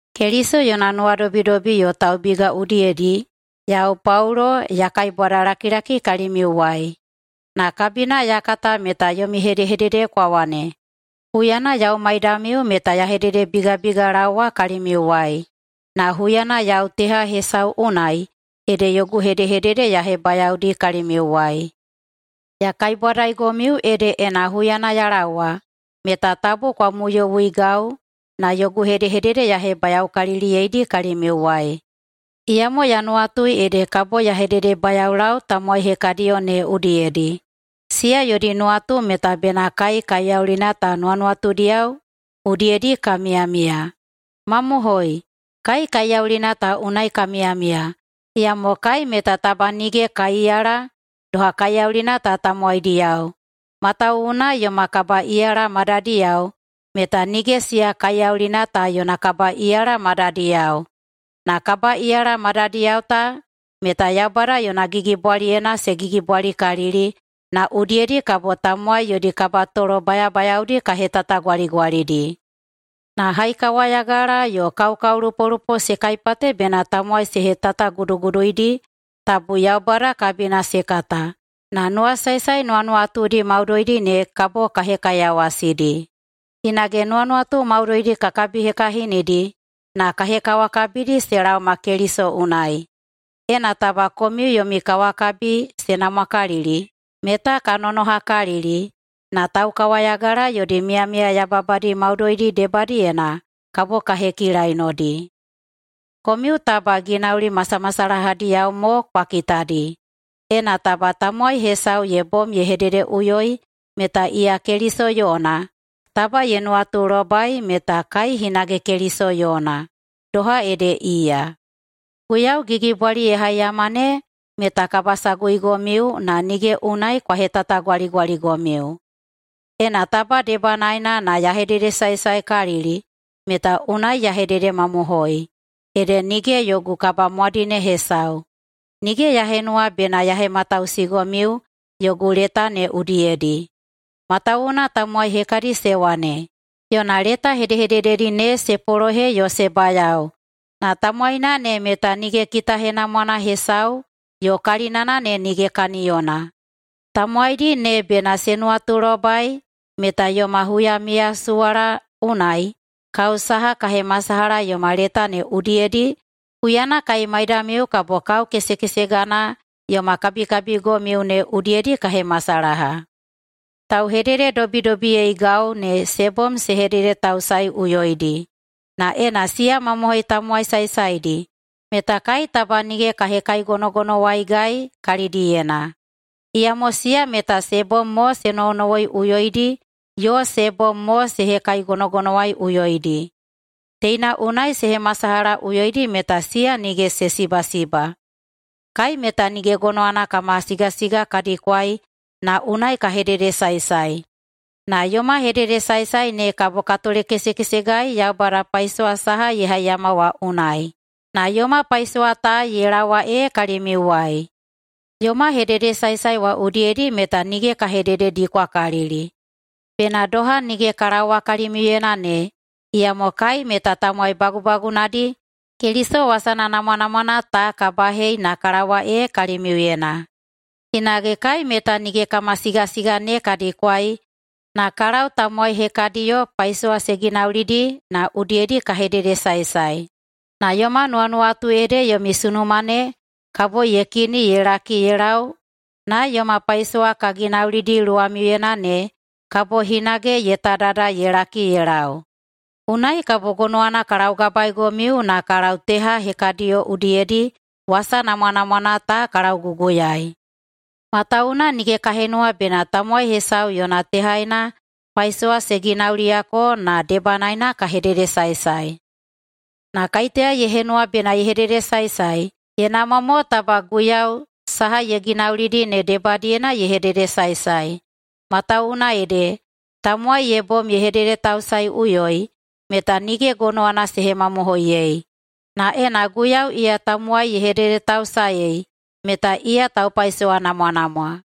Keliso yona nuwadobidobi yo taubiga udiyedi yau, Paulo, ya kaibwadalakilaki kalimiuwai. Na [kabina ya kata meta yomi hedehedede kwa wane] huyana yau maidamiu meta ya hededebigabigalaowa kalimiuwai, na huyana yau teha hesau unai ede yogu hedehedede ya hebayaodi kalimiuwai. Ya kaibwadaigomiu ede ena huyana ya laowa meta tabu kwa muyowuigau na yogu hedehedede ya hebayaokaliliyeidi kalimiuwai. Iyamo ya nuwatui ede kabo ya hededebayaolau tamowai hekadiyo ne udiyedi, siya yodi nuwatu meta bena kai kaiyaulina ta nuwanuwatudiyao udiyedi ka miyamiya. Mamohoi, kai kaiyaulina ta unai ka miyamiya, iyamo kai meta taba nige ka iyala doha kaiyaulina ta tamowaidiyao. Matawuwuna yoma kabaꞌiyala madadiyao meta nige siya kaiyaulina ta yona kabaꞌiyala madadiyao. Na kabaꞌiyala madadiyao ta meta Yaubada yona gigibwaliyena se gigibwalikalili na udiyedi kabo tamowai yodi kabatolo bayabayaodi ka hetatagwaligwalidi. Na haikawayagala yo kaokaolupolupo se kaipate bena tamowai se hetataguduguduidi tabu Yaubada kabina se kata, na nuwasaesae nuwanuwatudi maudoidi ne kabo ka hekaiyawasidi. Hinage nuwanuwatu maudoidi ka kabihekahinidi na ka hekawakabidi se laoma Keliso unai. Ena taba komiu yomi kawakabi se namwakalili, meta ka nonohakalili na taukawayagala yodi miyamiya yababadi maudoidi debadiyena kabo ka hekilainodi. Komiu taba ginauli masamasalahadiyao mo kwa kitadi! Ena taba tamowai hesau ye bom ye hededeꞌuyoi meta iya Keliso yona, taba ye nuwatulobai meta kai hinage Keliso yona, doha ede iya. Guiyau gigibwali ye haiyama ne meta kabasaguigomiu na nige unai ka hetatagwaligwaligomiu. Ena taba debanaena na ya hededesaesaekalili meta unai [ya hededemamohoi, ede] nige yogu kabamwadine hesau. Nige ya henuwa bena ya hematausigomiu yogu leta ne udiyedi. Matawuwuna tamowai hekadi se wane, “Yona leta hedehedededi ne se polohe yo se bayao na tamowaina ne meta nige kitahenamwana hesau yo kalinana ne nige kaniyona.” Tamowaidi ne bena se nuwatulobai meta yoma huyamiyasuwala unai kao saha ka hemasalaha yoma leta ne udiyedi, huyana kai maidamiu kabo kao kesekesegana yoma kabikabigomiu ne udiyedi ka hemasalaha. Tauhedededobidobiyeigau ne se bom se hededetausaeiꞌuyoidi. Na ena siya mamohoi tamowai saesaedi, meta kai taba nige ka hekaigonogonowaigai kalidiyena. Iyamo siya meta se bom mo se nowonowoiꞌuyoidi yo se bom mo se hekaigonogonowaiꞌuyoidi. Teina unai se hemasalahaꞌuyoidi meta siya nige se sibasiba. Kai meta nige gonowana kama sigasiga ka dikwai na unai ka hededesaesae, na yoma hededesaesae ne kabo ka tolekesekesegai Yaubada paisowa saha ye haiyama wa unai. Na yoma paisowa ta ye laowa ee kalimiuwai. Yoma hededesaesae wa udiyedi meta nige ka hedededikwakalili, bena doha nige ka laowa kalimiuyena ne, iyamo kai meta tamowai bagubagunadi Keliso wasana namwanamwana ta ka bahei na ka laowa ee kalimiuyena. Hinage kai meta nige kama sigasiga ne ka dikwai na ka lau tamowai hekadiyo paisowa se ginaulidi na udiyedi ka hededesaesae. Na yoma nuwanuwatu ede yomi sunuma ne kabo ye kini ye laki ye lau na yoma paisowa ka ginaulidi luwamiuyena ne kabo hinage ye tadada ye laki ye lau. Unai kabo gonowana ka laugabaeigomiu na ka lau teha hekadiyo udiyedi wasa namwanamwana ta ka lauguguyaei. Matawuwuna nige ka henuwa bena tamowai hesau yona tehaena paisowa se ginauliyako na debanaena ka hededesaesae. Na “kaiteya ye henuwa bena ye hededesaesae, ye namwa mo taba Guiyau saha ye ginaulidi ne debadiyena ye hededesaesae”. Matawuwuna ede, tamowai ye bom ye hededetausaeiꞌuyoi meta nige gonowana se hemamohoiyei, na ena Guiyau iya tamowai ye hededetausaei, meta iya taupaisowanamwanamwa.